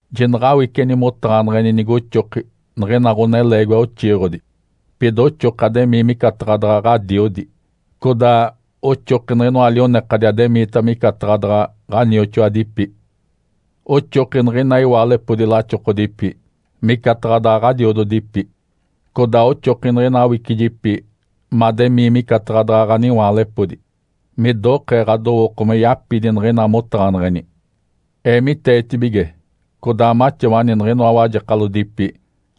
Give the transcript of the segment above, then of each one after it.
Jinaɡ̶awiceni motaɡ̶aneɡ̶eni nigoxoki niɡ̶ina ɡ̶oneleegiwa oxiiɡ̶odi, pida oxoki ademii micataɡ̶a daɡ̶a ɡ̶adiodi. Codaa oxoki niɡ̶inoa lionekadi ademiita micataɡ̶a daɡ̶a ɡ̶anioxoadipi. Oxoki niɡ̶ina iwaalepodi laxokodipi micataɡ̶a daɡ̶a ɡ̶adiododipi. Codaa oxoki niɡ̶ina awicijipi mademii micataɡ̶a daɡ̶a ɡ̶aniwaalepodi, midokee ɡ̶adowooko me yapidi niɡ̶ina motaɡ̶aneɡ̶eni. Eemiteetibige codaa maxawani niɡ̶inoa wajekalodipi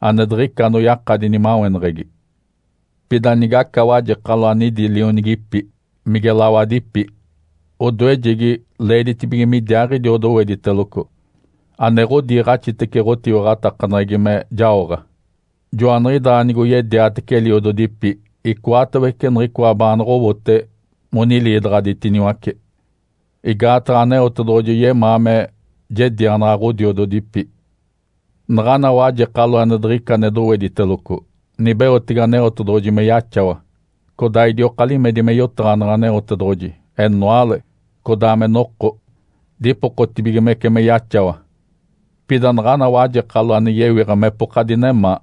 ane diɡ̶ica anoyakadi nimaweneɡ̶egi. Pida nigaca wajekalo ane idi lionigipi, mige lawadipi, odoejegi leeditibige midiaaɡ̶idi odowediteloco, ane ɡ̶odiiɡ̶axitece ɡ̶otiwaɡ̶atakaneɡ̶egi me jaoɡ̶a. Joaniɡ̶idaa nigoyediatece eliododipi icoatawece niɡ̶icoa baanoɡ̶owote moniliidaɡ̶aditiniwace. Igaataɡ̶a Aneotedoɡ̶oji yemaa me jedianaɡ̶a ɡ̶odiododipi. Naɡ̶ana wajekalo ane diɡ̶ica ane dowediteloco, nibeotege Aneotedoɡ̶oji me yaxawa, codaa idioka limedi me yotaɡ̶aneɡ̶e Aneotedoɡ̶oji, enoale, codaa me noko, dipokotibigimece me yaxawa. Pida naɡ̶ana wajekalo ane yewiɡ̶a mepoka dinemaa,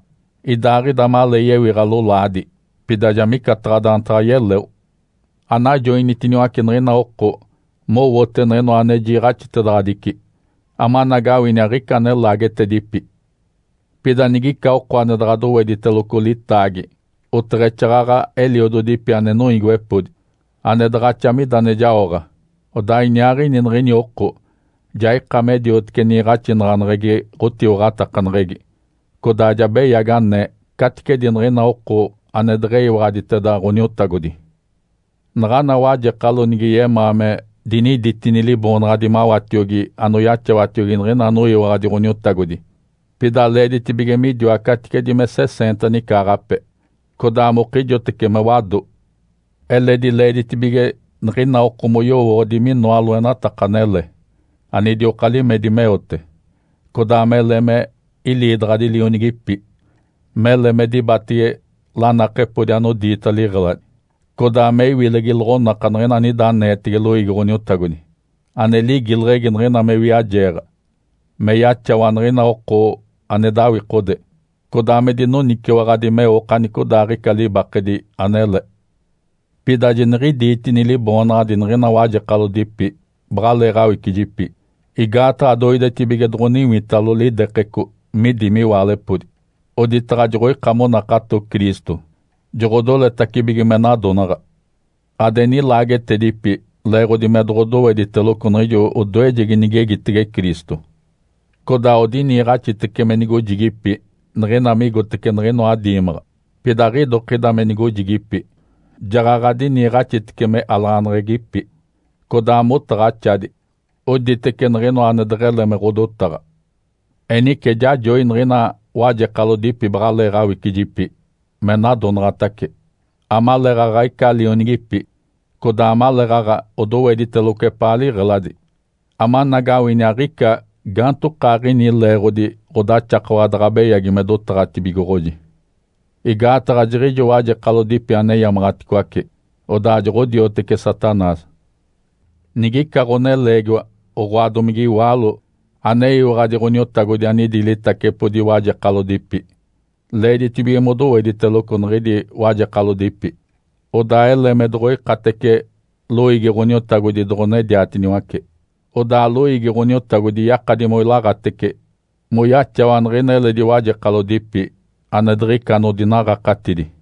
idaaɡ̶ida malee yewiɡ̶a lolaadi, pida ja micataɡ̶a daantaɡ̶a yeleo. Anajoinitiniwace niɡ̶ina oko mowote niɡ̶inoa ane jiiɡ̶axitedaɡ̶adici, amanagawini aɡ̶ica ane laagetedipi. Pida nigica oko ane daɡ̶a dowediteloco litaagi, oteɡ̶exaaɡ̶aɡ̶a eliododipi ane noiigiwepodi, ane daɡ̶axa mida ane jaoɡ̶a, odaa iniaaɡ̶ini niɡ̶ini oko ja ika me diotece niiɡ̶axinaɡ̶aneɡ̶egi ɡ̶otiwaɡ̶atakaneɡ̶egi, codaa ja beyagi anee caticedi niɡ̶ina oko ane deɡ̶eyiwaɡ̶aditeda Ǥoniotagodi. Naɡ̶ana wajekalo nige yemaa me diniditini liboonaɡ̶adi mawatiogi anoyaxawatiogi niɡ̶ina anoyiwaɡ̶adi Ǥoniotagodi, pida leeditibige midiwa caticedi me seseenta nicaaɡ̶ape, codaa mokijotece me wado. Eledi leeditibige niɡ̶ina oko moyowooɡ̶odi minoa loenataka anele anidioka limedi meote, codaa mele me iliidaɡ̶adi lionigipi, mele me dibatege lanakepodi anodiita liɡ̶eladi, codaa me iwilegi loɡ̶onaka niɡ̶ina anida aneetege loiigi Ǥoniotagodi (ane ligileɡ̶egi niɡ̶ina me wiajeeɡ̶a), me yaxawa niɡ̶ina oko ane dawikode, codaa me dinoniciwaɡ̶adi meo okanicodaaɡ̶ica libakedi anele. Pida jiniɡ̶idiitini liboonaɡ̶adi niɡ̶ina wajekalodipi baɡ̶aleeɡ̶awicijiipi. Igaataɡ̶a doidetibige doɡ̶oniwitalo lidekeco midi miwaalepodi, oditaɡ̶a joɡ̶oika monakato Cristo, joɡ̶odoletacibige me nadonaɡ̶a. Ade nilaagetedipi leeɡ̶odi me doɡ̶odowediteloco niɡ̶ijo odoejegi nigegitege Cristo. Codaa odiniiɡ̶axitece me nigojigipi niɡ̶ina migotece niɡ̶inoa diimaɡ̶a. Pida aɡ̶idokida me nigojigipi, jaɡ̶aɡ̶a diniiɡ̶axitece me alaɡ̶aneɡ̶egipi, codaa motaɡ̶axadi, oditece niɡ̶inoa ane deɡ̶ele me ɡ̶odotaɡ̶a. Enice jajoi niɡ̶ina wajekalodipi baɡ̶alee awicijipi me nadonaɡ̶atace, amaleeɡ̶aɡ̶a ica lionigipi, codaa amaleeɡ̶aɡ̶a odowediteloco epaa liɡ̶eladi, amanagawini aɡ̶ica gaantokaaɡ̶ini leeɡ̶odi ɡ̶odaxakawa daɡ̶a beyagi me dotaɡ̶atibigoɡ̶oji. Igaataɡ̶a jiɡ̶ijo wajekalodipi aneyamaɡ̶aticoace, odaa joɡ̶odioteci Satanás. Nigica ɡ̶oneleegiwa, oɡ̶oa domige iwaalo aneyiwaɡ̶adi Ǥoniotagodi anidi litacepodi wajekalodipi, leeditibige modowediteloco niɡ̶idi wajekalodipi, odaa ele me doɡ̶oikatece loiigi Ǥoniotagodi doɡ̶onediatiniwace. Odaa loiigi Ǥoniotagodi yakadi moilaaɡ̶atece moyaxawa niɡ̶ina eledi wajekalodipi ane diɡ̶ica anodinaɡ̶akatidi.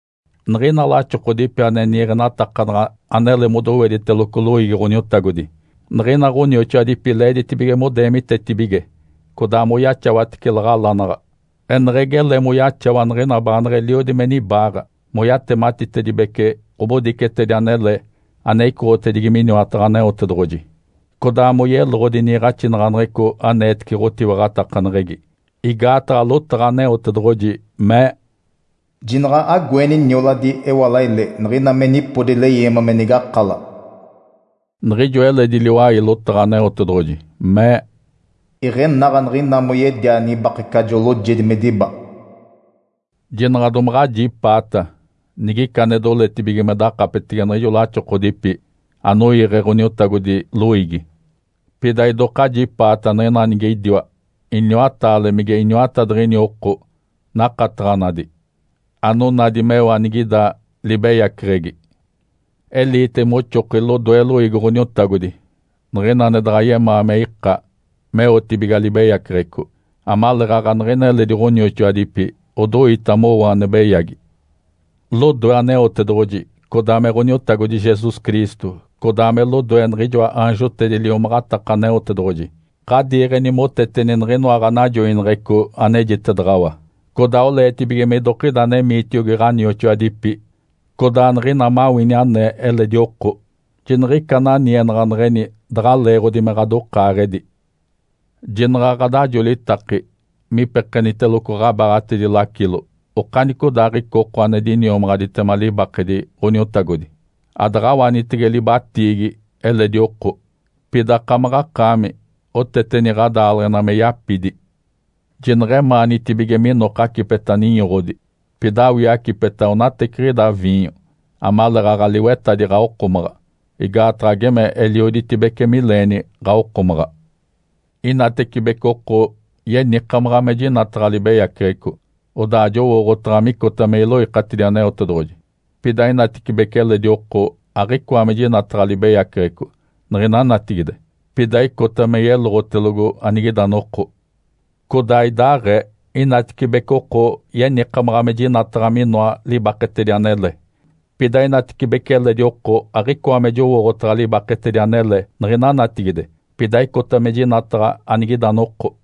Niɡ̶ina laxokodipi ane niiɡ̶enatakanaɡ̶a anele modowediteloco loiigi Ǥoniotagodi, niɡ̶ina ɡ̶onioxoadipi leeditibige modeemitetibige codaa moyaxawatece laɡ̶alanaɡ̶a, eneɡ̶egi ele moyaxawa niɡ̶ina baaneɡ̶eliodi me nibaaɡ̶a, moyatematitedibece ɡ̶obodicetedi anele ane icoɡ̶otedigi miniwataɡ̶a Aneotedoɡ̶oji, codaa moyeloɡ̶odi niiɡ̶axinaɡ̶aneɡ̶eco aneetece ɡ̶otiwaɡ̶atakaneɡ̶egi. Igaataɡ̶a lotaɡ̶a Aneotedoɡ̶oji mee, “Jinaɡ̶a agoeni nioladi ewalaile niɡ̶ina me nipodi leyeema me nigakala.” Niɡ̶ijo eledi liwai lotaɡ̶a Aneotedoɡ̶oji mee, “Iɡ̶enaɡ̶a niɡ̶ina moyedia nibakecajo loojedi me diba.” Jinaɡ̶a domaɡ̶a ajipaata nigica ane doletibige me dakapetege niɡ̶ijo laxokodipi anoiiɡ̶e Ǥoniotagodi loiigi. Pida idoka ajipaata niɡ̶ina nige idiwa iniwataale mige iniwatadiɡ̶ini oko nakataɡ̶anadi, anonadi meo anigida libeyaceɡ̶egi. Eliite moxoki lodoe loiigi Ǥoniotagodi niɡ̶ina ane daɡ̶a yemaa me ika meotibiga libeyaceɡ̶eco, amaleeɡ̶aɡ̶a niɡ̶ina eledi ɡ̶onioxoadipi odoita mowo ane beyagi. Lodoe Aneotedoɡ̶oji, codaa me Ǥoniotagodi Jesus Cristo, codaa me lodoe niɡ̶ijoa aanjotedi liomaɡ̶ataka Aneotedoɡ̶oji, ɡ̶adiiɡ̶eni moteteni niɡ̶inoa ɡ̶anajoineɡ̶eco anejitedaɡ̶awa. Codaa oleetibige midokida anemiitiogi ɡ̶onioxoadipi, codaa niɡ̶ina mawini anee eledi oko, jiniɡ̶ica ananienaɡ̶aneɡ̶eni daɡ̶a leeɡ̶odi me ɡ̶adokaaɡ̶edi. Jinaɡ̶a ɡ̶adajolitaki me ipekeniteloco ɡ̶abaaɡ̶atedi lacilo okanicodaaɡ̶ica oko ane diniomaɡ̶aditema libakedi Ǥoniotagodi. Adaɡ̶awanitege libatiigi eledi oko. Pida akamaɡ̶akaami oteteni ɡ̶adaaleɡ̶ena me yapidi. Jineɡ̶emaanitibige minoka acipeta ninyoɡ̶odi, pida awii acipeta onateciɡ̶ida viinyo amaleeɡ̶aɡ̶a liwetadi ɡ̶awokomaɡ̶a, igaataɡ̶a geme elioditibece mileeni ɡ̶awokomaɡ̶a. Inatibece oko yenikamaɡ̶a me jinataɡ̶a libeyaceɡ̶eco, odaa jowooɡ̶otaɡ̶a micota me iloikatidi Aneotedoɡ̶oji. Pida inatecibece eledi oko aɡ̶icoa me jinataɡ̶a libeyaceɡ̶eco niɡ̶ina natigide, pida icota me yeloɡ̶otelogo anigida noko. Codaa idaaɡ̶ee, inatecibece oko yenikamaɡ̶a me jinataɡ̶a minoa libaketedi anele, pida inatecibece eledi oko aɡ̶icoa me jowooɡ̶otaɡ̶a libaketedi anele niɡ̶ina natigide, pida icota me jinataɡ̶a anigida noko.